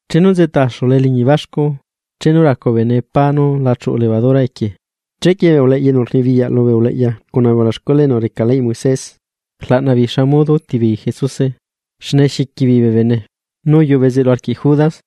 Chenu nzeꞌta axula eliñi baxcu, chenu racu bee bene pá nú la chuꞌu levadura equie, chequie bee uleꞌya enu rnibiyaꞌ lubee uleꞌya cuna bee ulaxcuela enu reca leyꞌ Moisés, rlaꞌna beei xa modo úti beei Jesuse, xne xiqui beei bee bene. Nu uyuꞌu bezeꞌlu arquiꞌ Judas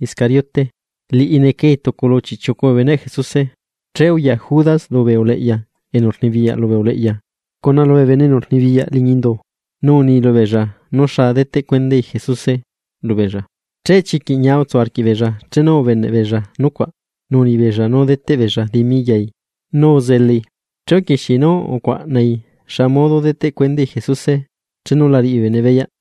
Iscariote, liꞌi necai tucu lu chiꞌchiucu bee beneꞌ Jesuse. Che uya Judas lubee uleꞌya enu rnibiyaꞌ lubee uleꞌya cuna lubee bene enu rnibiyaꞌ liñi indu, nu uni lubeella nú xa deteꞌ cuendai Jesuse lubeella. Che chiquiꞌ ñia utsu arquiꞌbeella chenu ubeneꞌ beella nucuaꞌ, nu uni beella nú deteꞌ beella dimi yai. Nu uzelai, che uquixiei nú ucuaꞌnai xa modo deteꞌ cuendai Jesuse chenu la riꞌi bee bene beyaꞌ.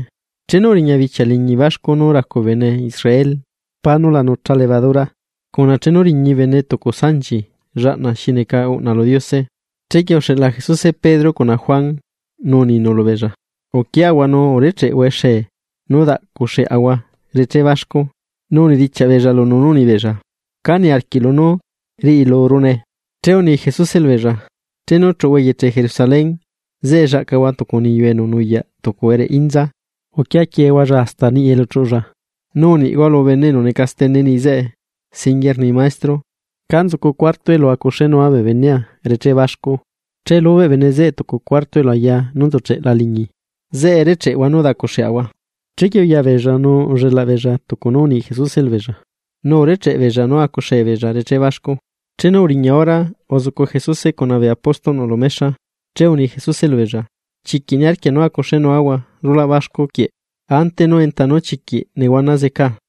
Chenu uriña bichia liñi baxcu nú racu bee bene Israel pá nú la nucha levadura, cuna chenu riñi bene tucu sanchi llaꞌna xi neca uꞌna lu Diose. Chequie uxeꞌla Jesuse Pedro cuna Juan, nú uninu lubeella: ―Uquiahua nu urecheꞌhua exee nú daꞌcuxeꞌahua reché baxcu. Nu unidichiaꞌ beella lunu nú uni beella: ―¿Cá niarquiꞌlu nú riꞌilurune? Che uni Jesuse lubeella: ―Chenu chuꞌuhua eyeche Jerusalén, zeꞌe llaꞌcahua tucu niyu enu nuyaꞌ tucu ereꞌe inza, uquia quieehualla hasta niꞌi elu chuꞌulla, nu uniꞌhua lu bene enu neca stene niꞌi zeꞌe: “Singuie rni Maestro, ¿Cá nzucu cuarto elu acuxénua bee benea reché baxcu?” Che lubeꞌ bene zeꞌe tucu cuarto elu ayaa nú nzucheꞌela liñi. Zeꞌe recheꞌehua nú daꞌcuxeꞌahua. Chequie uya beella nu ullelaꞌ beella tucu nú uni Jesuse lubeella, nu urecheꞌe beella nú acuxee beella reché baxcu. Chenu uriña hora, uzucu Jesuse cuna bee apóstolꞌnu lu mexa. Che uni Jesuse lubeella: ―¡Chiquiꞌ niarquia nú acuxenuahua rulaꞌ baxcu quieꞌ ante nú enta nú chiquiꞌ nehuana zecaa!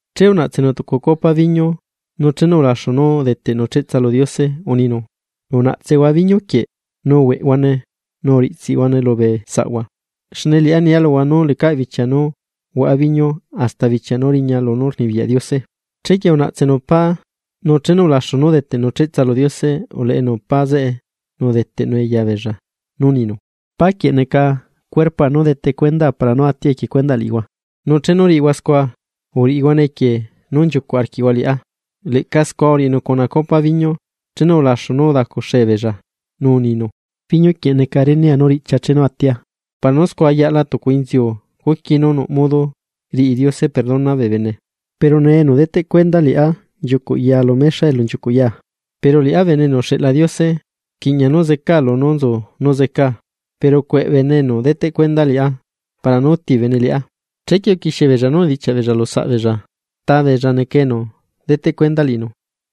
Che unaꞌtsenu tucu copa biñu, nu chenu ulaxu nú udeteꞌnu cheꞌtsa lu Diose, uninu: ―Unaꞌtsehua biñu quieꞌ nu uhueꞌhuane nu uriꞌtsiꞌhuane lubee saꞌhua. Xne liꞌá nia luhua nú lecaꞌ bichia nú huaꞌa biñu hasta bichia nú riña lunú rnibiyaꞌ Diose. Chequie unaꞌtsenu pá, nu chenu ulaxu nú udeteꞌnu cheꞌtsa lu Diose, uleꞌenu pá zeꞌe nu udeteꞌnue yabeella, nu uninu: ―Pá quieꞌ neca cuerpoa nú detecuendaa chenu atia equie cuendaꞌ liꞌihua. Nu chenu riꞌihua scua, uriꞌihuane equie nú nchiucuꞌ arquiꞌhua liꞌá. Leꞌca scua uriꞌinu cuna copa biñu chenu ulaxu nú udacuxee beella, nu uninu: ―Biñu quieꞌ neca renea nú riꞌchia chenu atia para nú scua yaꞌla tucu inziu cuqui nú nuꞌ modo riꞌi Diose perdona bee bene. ’Pero nee enu deteꞌ cuenda liꞌá nchiucuꞌ ya lu mexa elu nchiucuꞌ yaa. Pero liꞌá Bene enu uxeꞌla Diose, rquiꞌña nú zecaa lunú nzu nú zecaa, pero ¡cueꞌe bene enu deteꞌ cuenda liꞌá para nú atia! Chequie uquixie beella nú unidichiaꞌ beella lu saꞌbeella, ta beella neca enu deteꞌ cuenda liꞌinu.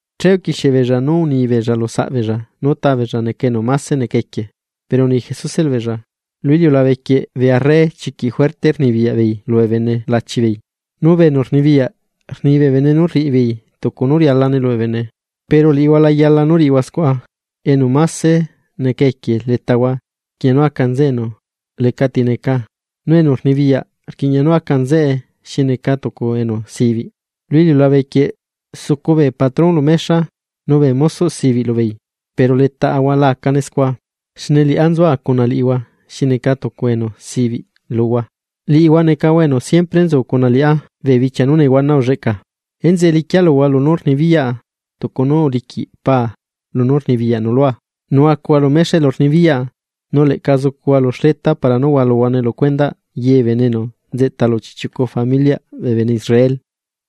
Che uquixie beella nú uni beella lu saꞌbeella nú ta beella neca enu mase neca equie. Pero uni Jesuse lubeella: ―Lu iliulabe quieꞌ bee arre chiquiꞌ juerte rnibiyaꞌ beei lubee bene lachi beei, nu bee enu rnibiyaꞌ rni bee bene nú rriꞌi beei tucu nú rialane lubee bene. Pero liꞌihua la yala nú riꞌihua scua, enu máse neca equie letahua, rquiꞌña nú aca nzeꞌe enu lecati neca, nu enu rnibiyaꞌ rquiꞌña nú aca nzeꞌe xi neca tucu enu sibiꞌ. Lu iliulabe quieꞌ sucu bee patrón lu mexa, nu bee mosoꞌ sibiꞌ lubeei. Pero letaꞌahua la acane scua, xne liꞌá nzua cuna liꞌihua xi neca tucu enu sibiꞌ luhua. ’Liꞌihua necahua enu siempre nzu cuna liꞌá bee bichia nú nehuana ulleꞌcaa. Enzeꞌe liquia luhua lunú rnibiyaꞌa, tucu nú uliquiꞌ paa lunú rnibiyaꞌnu lua, nu acuhua lu mexa elu nibiyaꞌa nu leꞌca zucuhua lu xleta para nú hualuhuane lu cuendaꞌ ye bee bene enu nzeꞌta lu chiꞌchiucu familiꞌ bee bene Israel.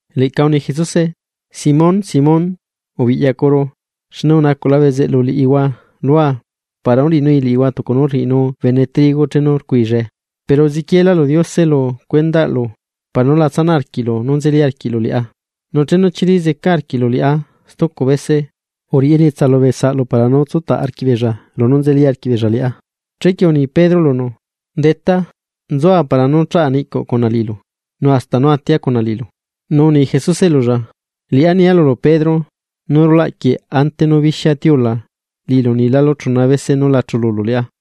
Leꞌca uni Jesuse: ―Simón, Simón, ubiꞌyacuru, xne unacuꞌla bezeꞌlu liꞌihua lua para nú riꞌinui liꞌihua tucu nú rriꞌinu bene trigo chenu rcuillae. Pero uziquieelá lu Diose lu cuendaꞌlu para nú la tsanaꞌarquiꞌlu nú nzeli arquiꞌlu liꞌá. Nu chenu chili zeca arquiꞌlu liꞌá stucu bese, uriꞌi elietsa lubee saꞌlu para nú tsutaꞌ arquiꞌbeella lunú nzeli arquiꞌ beella liꞌá. Chequie uni Pedro lunu: ―Detá, nzua para nú chaꞌa niꞌcuꞌ cuna liꞌilu, nu hasta nú atia cuna liꞌilu. Nu uni Jesuse lulla: ―Liꞌá nia lulu Pedro, nú rulaꞌ quieꞌ, ante nú bixia tiula, liꞌilu unilálu chuna bese nú la chululu liꞌá.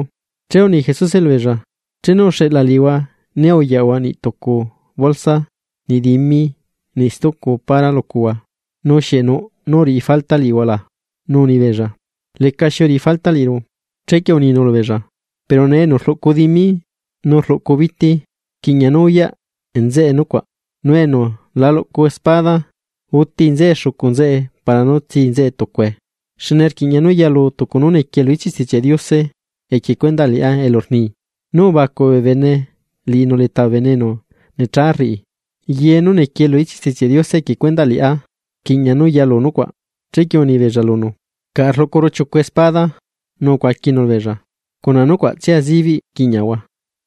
Che uni Jesuse lubeella: ―Chenu uxeꞌla liꞌihua né uyaꞌhua niꞌ tucu bolsa, niꞌ dimi niꞌ stucu para lucuhua, ¿nu xieꞌ nuꞌ nú uriꞌi falta liꞌihua la? Nu uni beella: ―Lecaxi uriꞌi falta liꞌiru. Chequie uninu lubeella: ―Pero nee enu rluꞌcu dimi nu rluꞌcu biti, rquiꞌña nú uyaꞌ nzeꞌe nucuaꞌ. Nu enu la luꞌcu espada, uti nzeꞌe xucu nzeꞌe para nú tsi nzeꞌe tucue. Xne rquiꞌña nú yalu tucu nú niquiee lu ichiꞌ Stichiaꞌ Diose equie cuendaꞌ liꞌá elu rni: “Nu ubacuꞌ bee bene liꞌinu leta bee bene enu necha rriꞌi.” Ye nú nequie lu ichiꞌ Stichiaꞌ Diose equie cuendaꞌ liꞌá, rquiꞌña nú yalu nucuaꞌ. Chequie uni beella lunu: ―Caꞌa rluꞌcuru chiucu espada. Nu ucuaquinu lubeella: ―Cuna nucuaꞌtsia zibiꞌ quiꞌñiaꞌahua.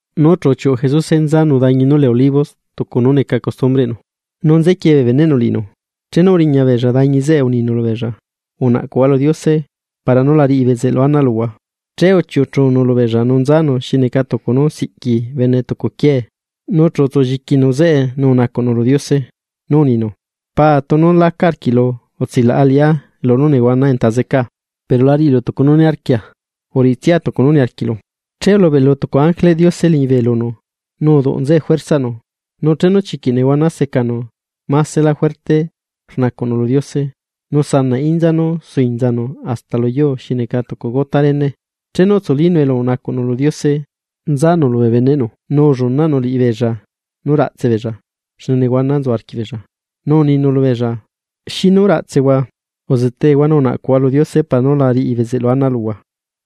Nu chu uchiuꞌu Jesuse nu nzanu dañi nú lee Olivos tucu nú neca costumbreꞌnu, nu nziquie bee beneꞌnu liꞌinu. Chenu uriña beella dañi zeꞌe uninu lubeella: ―Unaꞌcuhua lu Diose, para nú la riꞌi bezeꞌlu ana luhua. Che uchiuꞌu chunu lubeella nu nzanu xi neca tucu nú siꞌqui bene tucu quiee, nu chu utsulliquinu zeꞌe nu unacuꞌnu lu Diose. Nu uninu: ―Paa, tunu laca arquiꞌlu, utsilaꞌa liꞌá lunú nehuana enta zecaa. Pero la riꞌilu tucu nú niarquia, uriꞌitsia tucu nú niarquiꞌlu. Che ulubeꞌlu tucu ángeleꞌ Diose liñibe lunu, nu uduꞌ nzeꞌe juerzaꞌnu. Nu chenu chiquiꞌ nehuana secanu, másela juerte rnacuꞌnu lu Diose, nu sanaꞌ inza nú suinzanu hasta lu yuu xi neca tucu gota réne. Chenu utsulínu elu unacuꞌnu lu Diose, nzanu lubee beneꞌnu nu ullunaꞌnu liꞌibeella nú raꞌtse beella, xne néhuana nzu arquiꞌbeella. Nu uninu lubeella: ―¿Xinu raꞌtsehua? Uzetehua nu unacuꞌhua lu Diose para nú la riꞌi bezeꞌlu ana luhua.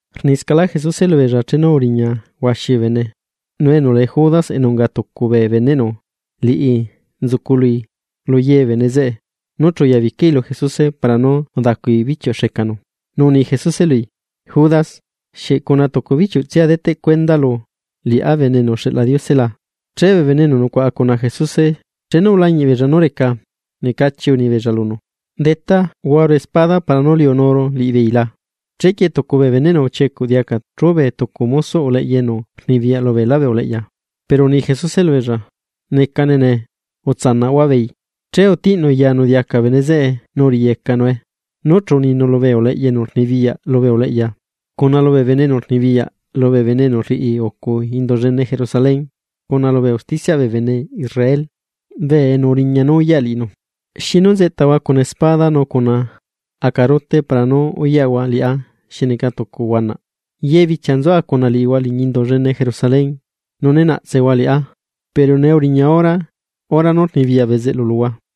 Rniscaꞌlá Jesuse lubeella, chenu uriña huaxi bee bene. Nu enu lee Judas, enu unga tucu bee beneꞌnu, liꞌi nzucului lu ye bee bene zeꞌe, nu chu uyabicai lu Jesuse para nú udacui bichiuꞌ xecanu. Nu uni Jesuse lui: ―Judas, ¿xieꞌ cuna tucu bichiuꞌtsia deteꞌ cuendalu liꞌá Bene enu uxeꞌla Diose la? Che bee bene enu nucuaꞌa cuna Jesuse, chenu ulañiꞌ beella nú reca, necachi uni beella lunu: ―¿Detá, huaru espada para nú liunuꞌahua liꞌibeei la? Chequie tucu bee beneꞌnu uchiecuꞌ diaca chubee tucu mosoꞌ uleꞌya enu rnibiyaꞌ lubeelá bee uleꞌya. Pero uni Jesuse lubeella: ―Necane nee, utsanaꞌhua beei. Che utiꞌnu yanu diaca bene zeꞌe nu uriꞌiyecanue. Nu chu uninu lubee uleꞌya enu rnibiyaꞌ lubee uleꞌya, cuna lubee bene enu rnibiyaꞌ lubee bene enu rriꞌi ucu Indu llene Jerusalén, cuna lubee usticiaꞌ bee bene Israel, enu uriña nú uyaꞌ liꞌinu: ―¿Xinu nzeꞌtahua cuna espada nu cuna acarute para nú uyaꞌhua liꞌá xi neca tucu huanaꞌ? Ye bichia nzua cuna liꞌihua liñi Indu llene Jerusalén nu ne naꞌtsehua liꞌá, pero nee uriña hora nú rnibiyaꞌ bezeꞌlu luhua.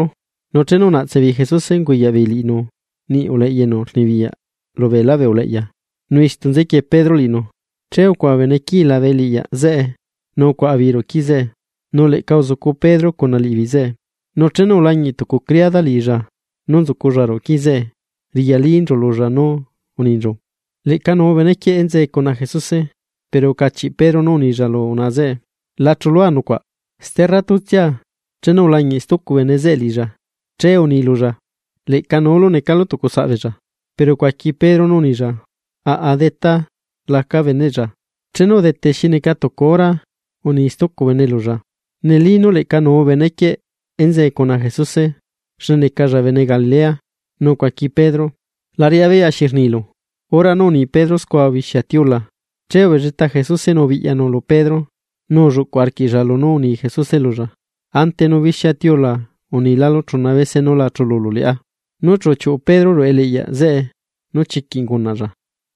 Nu chenu unaꞌtse beei Jesuse, unguyaꞌ beei liꞌinu niꞌi uleꞌya enu rnibiyaꞌ lu beelá bee uleꞌya, nu istu nzequie Pedro liꞌinu. Che ucuaꞌa bee bene quii labe eliꞌyaꞌ zeꞌe, nu ucuaꞌa beei ruꞌu quii zeꞌe, nu leꞌca uzucu Pedro cuna liꞌibeei zeꞌe. Nu chenu ulañiꞌ tucu criada liꞌilla nú nzuculla ruꞌu quii zeꞌe, riꞌyalinchu lulla nu uninchu: ―Leꞌca nuu bene quieꞌ enzee cuna Jesuse. Pero ucachiꞌ Pedro nú unilla lu unaꞌa zeꞌe: ―La chulua nucuaꞌ. Sterratutsia, chenu ulañiꞌ stucu bene zeꞌe liꞌilla, che uni lulla: ―Leꞌca nuulu necalu tucu saꞌ beella. Pero ucuaqui Pedro nú unilla: ―Aꞌa déta, laca beneꞌlla. Chenu udete xi neca tucu hora, uni stucu bene lulla: ―Neli nú leꞌca nuu bene quieꞌ enzee cuna Jesuse, xne necalla bene Galilea. Nu ucuaqui Pedro: ―La riꞌá beyaꞌ xi rnilu. Hora nú rni Pedro scua ubixia tiula. Che ubelleta Jesuse nu ubiꞌyanu lu Pedro, nu ulluꞌcu arquiꞌlla lunú uni Jesuse lulla: “Ante nú bixia tiula unilalu chuna bese nú la chululu liꞌá.” Nu chu uchiuꞌu Pedro ruꞌu eliꞌyaꞌ zeꞌe, nu chiquiꞌ ungunaꞌlla.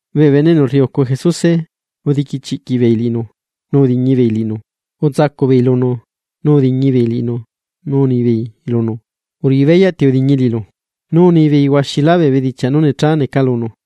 Bee bene enu rriucu Jesuse, udiquichiꞌquiꞌ beei liꞌinu, nu udiñi beei liꞌinu. Utsacuꞌ beei lunu, nu udiñi beei liꞌinu nu unibeei lunu: ―¡Uriꞌi beyaꞌ ti udiñi liꞌilu! Nu unibeei huaxilá bee bedichiaꞌ nú necha neca lunu.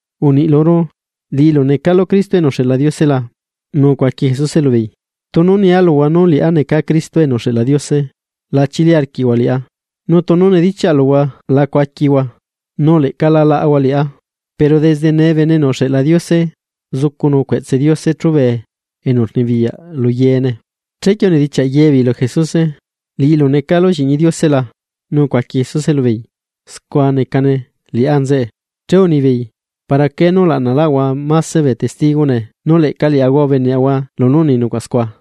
―Uniꞌ luru, ¿liꞌilu necalu Cristo enu uxeꞌla Diose la? Nu ucuaqui Jesuse lubeei: ―Tunu nia luhua nú liꞌá neca Cristo enu uxeꞌla Diose, la chili arquiꞌhua liꞌá. Nu tunu nedichiaꞌa luhua la cuaquihua, nu leꞌca la laꞌahua liꞌá. Pero desde nee Bene enu uxeꞌla Diose zucunu cueꞌtse Diose chubee enu rnibiyaꞌ lu yeene. Chequie unidichiaꞌ ye beei lu Jesuse: ―¿Liꞌilu necalu Lliꞌñi Diose la? Nu ucuaqui Jesuse lubeei: ―Scua necane liꞌá nzeꞌe. Che unibeei: ―¿Para qué nú laꞌnalaꞌahua máse bee testigo nee? Nu leꞌca liaꞌahua ubeneꞌahua lunú uni nucuaꞌ scua.